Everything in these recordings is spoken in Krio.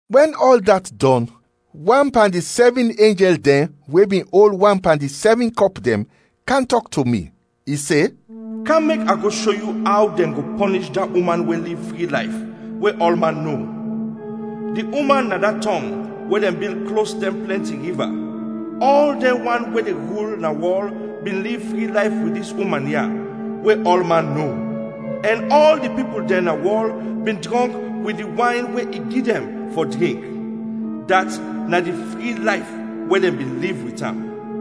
Wɛn ɔl dat dɔn, wan pan di sɛvin enjɛl dɛn we bin ol wan pan di sɛvin kɔp dɛn, kam tɔk to mi, i se, “Kam, mek a go sho yu aw dɛn go pɔnish da uman we liv fri layf we ɔlman no; di uman na da tɔng we dɛn bil klos dɛn plɛnti riva. Ɔl dɛn wan we de rul na wɔl bin liv fri layf wit dis uman ya we ɔlman no, ɛn ɔl di pipul dɛn na wɔl bin drɔnk wit di wayn we i gi dɛn fɔ drink, dat na di fri layf we dɛn bin liv wit am.”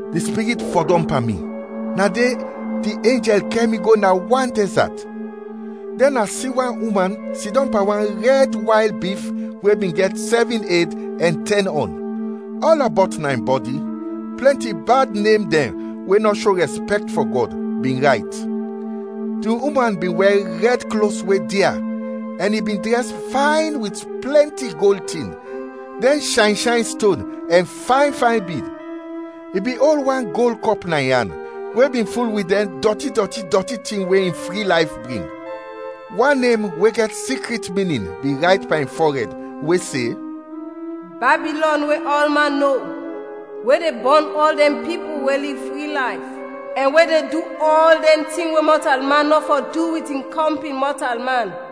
Di Spirit fɔdɔm pan mi, na de di enjɛl kɛr mi go na wan dɛzat. Dɛn a si wan uman sidɔm pan wan rɛd wayl bif we bin gɛt sɛvin ed ɛn tɛn ɔn; ɔlɔbɔt na in bɔdi plɛnti bad nem dɛn we nɔ sho rɛspɛkt fɔ Gɔd, bin rayt. Di uman bin wɛr rɛd klos we dia, ɛn i bin drɛs fayn wit plɛnti gold tin, dɛn shayn shayn ston ɛn fayn fayn bid. I bin ol wan gold kɔp na in an, we bin ful wit dɛn dɔti dɔti dɔti tin we in fri layf bring. Wan nem we gɛt sikrit minin bin rayt pan in fɔrɛd, we se “Babilɔn we ɔlman no, we de bɔn ɔl dɛn pipul we liv fri layf, ɛn we de du ɔl dɛn tin we mɔtalman nɔ fɔ du wit in kɔmpin mɔtalman.”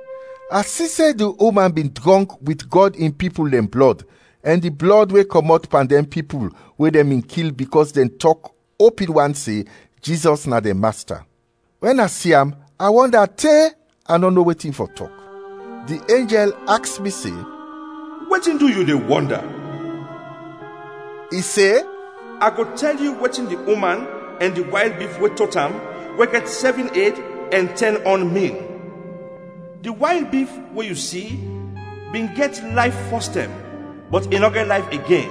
A si se di uman bin drɔnk wit Gɔd in pipul dɛn blɔd ɛn di blɔd we kɔmɔt pan dɛn pipul we dɛn bin kil bikɔs dɛn tɔk opin wan se Jizɔs na dɛn Masta. Wɛn a si am a wɔnda te a nɔ no wetin fɔ tɔk. Di enjɛl aks mi se, “Wetin du yu de wɔnda?” I se, “A go tɛl yu wetin di uman ɛn di wayl bif we tot am, we gɛt sɛvin ed ɛn tɛn ɔn, min. Di wayl bif we yu si bin gɛt layf fɔstɛm, bɔt i nɔ gɛt layf igen,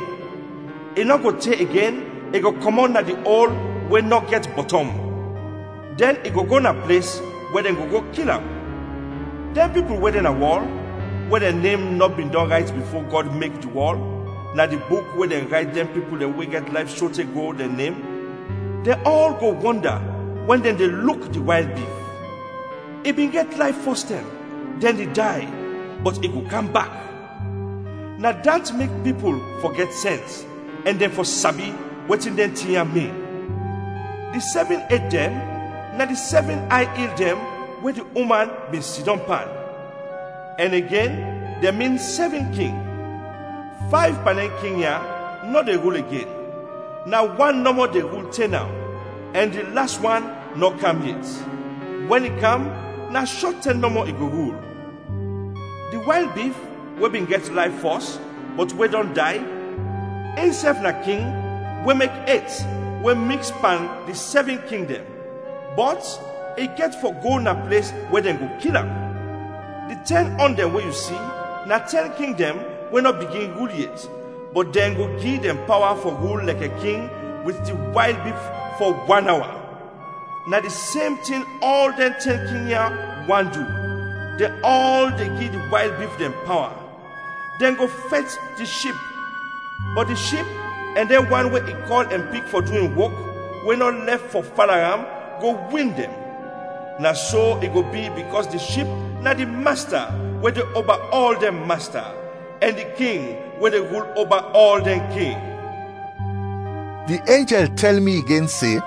i nɔ go te igen i go kɔmɔt na di ol we nɔ gɛt bɔtɔm, dɛn i go go na ples we dɛn go go kil am. Dɛn pipul we de na wɔl, we dɛn nem nɔ bin dɔn rayt bifo Gɔd mek di wɔl, na di buk we dɛn rayt dɛn pipul we gɛt layf sote go dɛn nem, dɛn ɔl go wɔnda wɛn dɛn de luk di wayl bif. I bin gɛt layf fɔstɛm, dɛn i day, bɔt i go kam bak. “Na dat mek pipul fɔ gɛt sɛns ɛn dɛn fɔ sabi wetin dɛn tin ya, min. Di sɛvin ed dɛn na di sɛvin ay il dɛn we di uman bin sidɔm pan. Ɛn igen dɛn min sɛvin king: fayv pan dɛn king ya nɔ de rul igen, na wan nɔmɔ de rul te naw, ɛn di las wan nɔ kam yet; wɛn i kam, na shɔt tɛm nɔmɔ i go rul. Di wayl bif we bin gɛt layf fɔs, bɔt we dɔn day, insɛf na king we mek et we miks pan di sɛvin king dɛn, bɔt i gɛt fɔ go na ples we dɛn go kil am. “Di tɛn ɔn dɛn we yu si na tɛn king dɛn we nɔ bigin rul yet, bɔt dɛn go gi dɛn pawa fɔ rul lɛkɛ king wit di wayl bif fɔ wan awa. Na di sem tin ɔl dɛn tɛn king ya want du, dɛn ɔl de gi di wayl bif dɛn pawa. Dɛn go fɛt di Ship bɔt di Ship ɛn dɛn wan we i kɔl ɛn pik fɔ du in wok, we nɔ lɛf fɔ fala am, go win dɛn. Na so i go bi bikɔs di Ship na di Masta we de oba ɔl dɛn masta, ɛn di King we de rul oba ɔl dɛn king.” Di enjɛl tɛl mi igen se,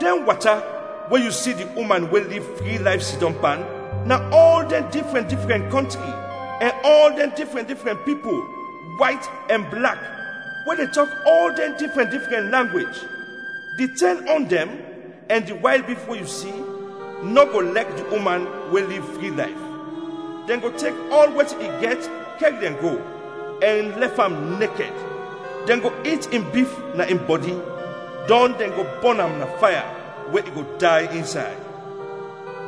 “Dɛn wata we yu si di uman we liv fri layf sidɔm pan, na ɔl dɛn difrɛn difrɛn kɔntri, ɛn ɔl dɛn difrɛn difrɛn pipul, wayt ɛn blak, we de tɔk ɔl dɛn difrɛn difrɛn langwej. Di tɛn ɔn dɛn, ɛn di wayl bif we yu si, nɔ go lɛk di uman we liv fri layf; dɛn go tek ɔl wetin i gɛt kɛr dɛn go, ɛn lɛf am nekɛd; dɛn go it in bif na in bɔdi, dɔn dɛn go bɔn am na faya we i go day insay.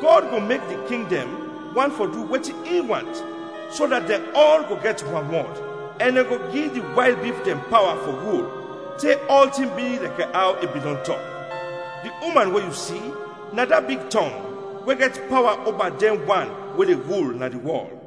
Gɔd go mek di king dɛn want fɔ du wetin in want, so dat dɛn ɔl go gɛt wanwɔd, ɛn dɛn go gi di wayl bif dɛn pawa fɔ rul, te ɔltin bi lɛkɛ aw i bin dɔn tɔk. “Di uman we yu si, na da big tɔng we gɛt pawa oba dɛn wan we de rul na di wɔl.”